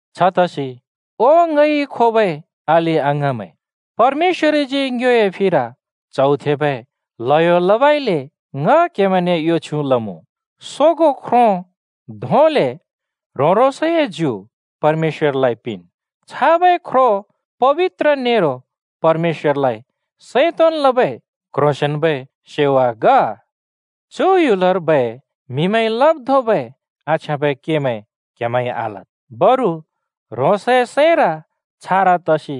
छतसि ओ ङइ खोबै अलि-अङाँमैं, परमेश्‍वरजी ङ्योए फिर च्हौ थेबै ल्हयो लबइले ङ क्‍हेमैंने यो छ्युँ लमुँ: सोगों ख्रो धोंले ह्रों-ह्रोंसए ज्यु परमेश्‍वरलाइ पिंन्। छाबै ख्रो पबित्र नेरो परमेश्‍वरलाइ सैं तोंन् लबै क्‍ह्रोंसेंन्‍बै सेवा ग। चु ह्‍युलर्बै म्‍हिमैंइ लब् धोंबै आछ्याँबै केमैं क्‍हेमैंइ आलद्, बरु ह्रोंसए सैंर छारा तसि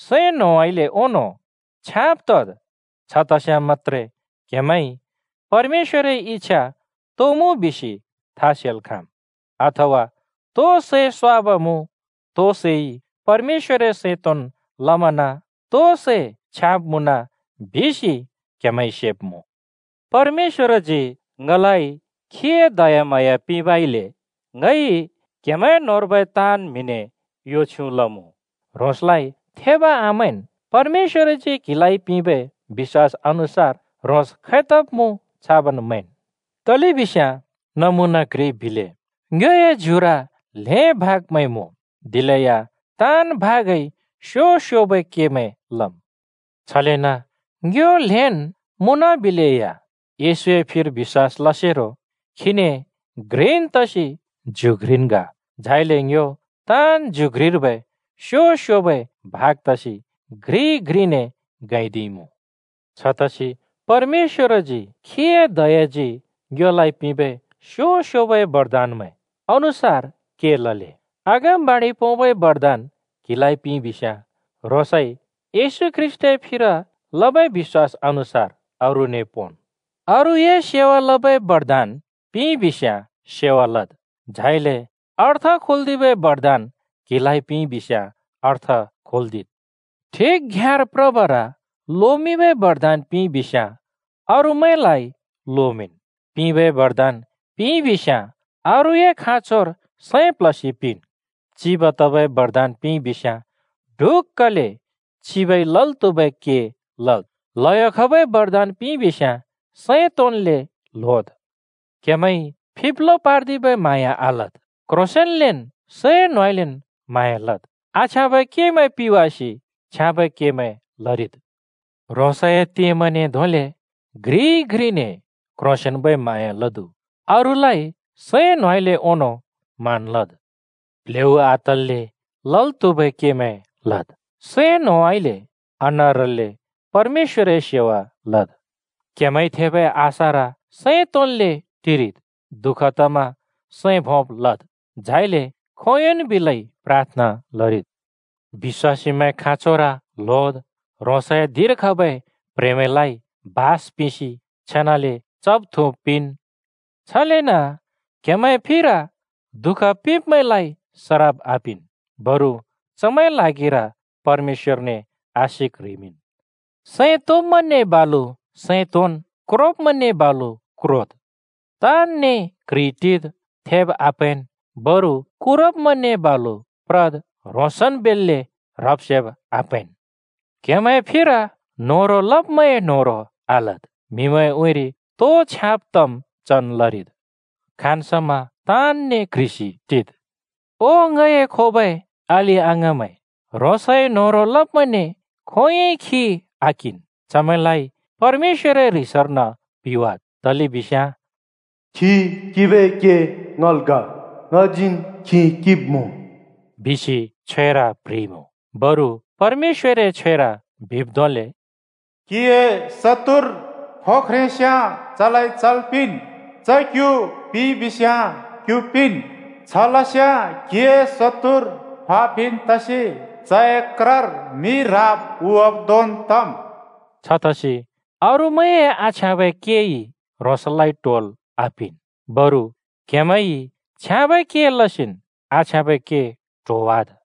सैं न्होंउँइँले ओंनों छ्याँब तद्। छ तस्‍याँ मत्‍त्रे क्‍हेमैंइ परमेश्‍वरए इच्छा तो मुँ बिसि था सेल् खाँम्, अथवा तो सै स्‍वाब मुँ, तो सैइ परमेश्‍वरए सैं तोंन् लमना, तो सै छ्याँब मुँन बिसि क्‍हेमैंइ सेब्‍मुँ। परमेश्‍वरजी ङलाइ खीए दयाम्हाँया पिंबइले ङइ क्‍हेमैं ताँनने यो छ्युँ लमुँ: ह्रोंसलाइ थेब आमैंन्, परमेश्‍वरजी क्हिलाइ पिंबै बिश्‍वास अनुसार ह्रोंस खैतब् मुँ छाबन् मैंन्। तलेबिस्याँ नमुना घ्रि बिले: ङ्योए ज्युर ल्हें भागमैं मुँ, दिलेया ताँन् भागइ स्‍यो स्‍योबै केमैं लम्। छलेन ङ्यो ल्‍हेंन् मुँनबिलेया येशूए फिर बिश्‍वास लसेरो खीने घ्रिन् तसि ज्यु घ्रिन् ग। झाइले ङ्यो ताँन् ज्यु घ्रिर्बै स्‍यो स्‍योबै भाग तसि घ्रि घ्रिने गैंदिइमुँ। छतसि परमेश्‍वरजी खीए दयाजी ङ्योलाइ पिंबै स्‍यो स्‍योबै बरदानमैं अनुसार के लले। अगमबाणि पोंबै बरदान क्हिलाइ पिंइबिस्‍याँ ह्रोंसइ येशू ख्रीष्‍टए फिर लबै बिश्‍वास अनुसार अरूने पोंन्। अरूए सेवा लबै बरदान पिंइबिस्‍याँ सेवा लद्। झाइले अर्थ खोल्‍दिबै बरदान क्हिलाइ पिंइबिस्‍याँ अर्थ खोल्‍दिद्। ठिक घ्‍याँर प्रबर लोमिंबै बरदान पिंइबिस्‍याँ अरूमैंलाइ लोमिंन्। पिंबै बरदान पिंइबिस्‍याँ अरूए खाँचोर सैं प्ल्हसि पिंन्। चिब तबै बरदान पिंइबिस्‍याँ ढुक्‍कले चिबइ लल् त्हुबै के लद्। ल्हयो खबै बरदान पिंइबिस्‍याँ सैं तोंन्‍ले ल्होद्। क्हेमैंइ फिब्लो पार्दिबै म्हाँया आलद्, क्‍ह्रोंसेंन्‍लेन् सैं न्होंउँइँलेन् म्हाँया लद्। आछ्याँबै केमैं पिवासि छ्याँबै केमैं लरिद्। ह्रोंसए तेमैंने धोंले घ्रिइ घ्रिने क्‍ह्रोंसेंन्‍बै म्हाँया लदु। अरूलाइ सैं न्होंउँइँले ओंनों मान लद्। प्ल्हेउ आतल्‍ले लल् त्हुबै केमैं लद्। सैं न्होंउँइँले आनारल्‍ले परमेश्‍वरए सेवा लद्। क्‍हेमैंइ थेंबै आशार सैं तोंन्ले टिरिद्। दुःख तमा सैं भोंब लद्। झाइले खोंयोंन् बिलै प्राथना लरिद्। बिश्‍वासीमैंए खाँचोर ल्होद्, ह्रोंसए धिंर खबै प्ह्रेंमैंलाइ बास पिंसि छेनाले चब् थुँब् पिंन्। छलेन क्हेमैंए फिर दुःख पिंब्‍मैंलाइ सराप आपिंन्, बरु चमैंए ल्हागिर परमेश्‍वरने आशिक ह्रिमिंन्। सैं तोंब्‍मैंने बालु सैं तोंन्, क्रोब्‍मैंने बालु क्रोद्। ताँनने क्‍ह्रिइ टिद्, थेब् आप्हैंन्, बरु कुरब्मैंने बालु प्रद्, ह्रोंसन् बेल्‍ले ह्रब्-सेब् आप्हैंन्। क्‍हेमैंए फिर न्होह्रों लब्मैंए न्होह्रों आलद्। म्‍हिमैंए उँइँरि तो छ्याँब तम् चन् लरिद्। खाँन् समा ताँनने क्ह्रिसि टिद्। ओ ङए खोबै अलि-अङाँमैं, ह्रोंसए न्होह्रों लब्मैंने खोंयोंइ खि आकिंन्। चमैंलाइ परमेश्‍वरए ह्रिसर्न पिवाद्, तलेबिस्याँ “खि किंबै के ङल् ग, ङजीन् खि किंब्‍मुँ,” बिसि छ्वेर प्ह्रिइमुँ। बरु परमेश्‍वरए छ्वेर बिब् धोंले, “क्‍हिए शत्तुर फो ख्रेंस्‍याँ चलाइ चल् पिंन्, च क्‍यु पिइबिस्‍याँ क्‍यु पिंन्। छ लस्याँ क्‍हिए शत्तुर फा पिन् तसि चए क्रर मि राब उँवाब् धोंन् तम्।” छतसि अरूमैंए आछ्याँबै केइ ह्रोंसलाइ ट्होल् आपिंन्, बरु क्हेमैंइ छ्याँबै के लसिन् आछ्याँबै के ट्होवाद्।